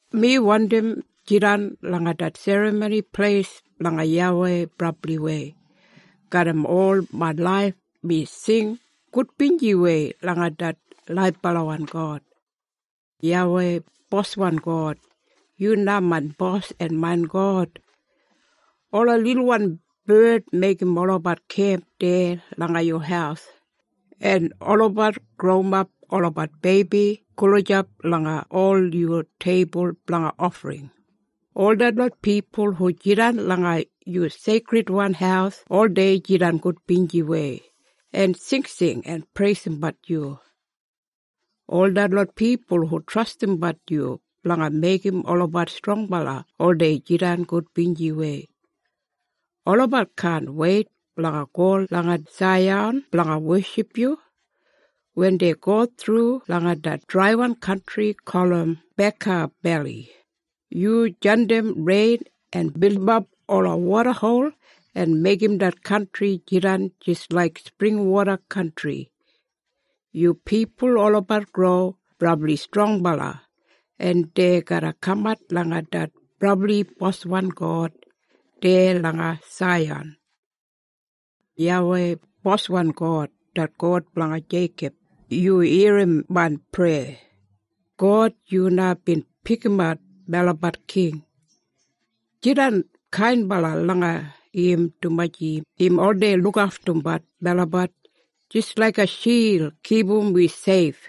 Mi wandim jidan langa det Serramoni Pleis blanga YAWEI brabliwei! Garram ol main laif mi sing gudbinjiwei langa det laibalawan God. YAWEI, Boswan God, yu na main bos en main God. Ola lilwan bard meigim olabat kemp deya langa yu haus, en olabat growimap olabat beibi gulijap langa ol yu teibul blanga ofring. Ol detlot pipul hu jidan langa yu seikridwan haus oldei jidan gudbinjiwei, en singsing en preisimbat yu. Ol detlot pipul hu trastimbat yu blanga meigim olabat strongbala oldei jidan gudbinjiwei. Olabat kaan weit blanga go langa Saiyan blanga weship yu. Wen dei go thru langa det draiwan kantri gulum Baka Beli, yu jandim rein en bilimap ola wodahol, en meigim det kantri jidan jis laik springwoda kantri. Yu pipul olabat gro brabli strongbala en dei garra kamat langa det Brabli Boswan God deya langa Saiyan. YAWEI, Boswan God, det God blanga Jeikob, yu irrim main preya. God, yu na bin pikimat melabat king. Jidan kainbala langa im dumaji im oldei lukaftumbat melabat jis laiga shild kipum wi seif.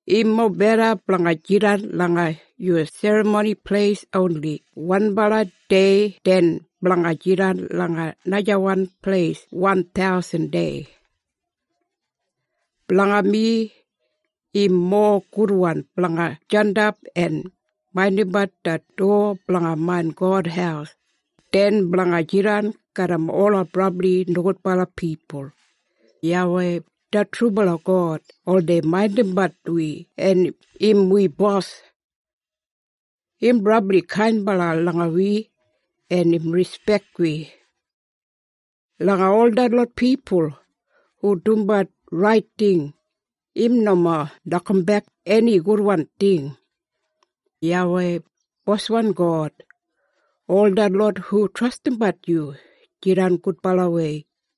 Im mobeda blanga jidan langa yu Serramoni Pleis oni wanbala dei den blanga jidan langa najawan pleis wan thausan dei. Blanga mi, im mowa gudwan blanga jandap en maindimbat det dowa blanga main God haus, den blanga jidan garram ola brabli nogudbala pipul. YAWEI, det trubala God oldei maindimbat wi en im wi bos. Im brabli kainbala langa wi en im rispek wi. Langa ol detlot pipul hu dumbat rait ting, im nomo nokambek eni gudwan ting. YAWEI, Boswan God, ol detlot hu trastimbat yu jidan gudbalawei.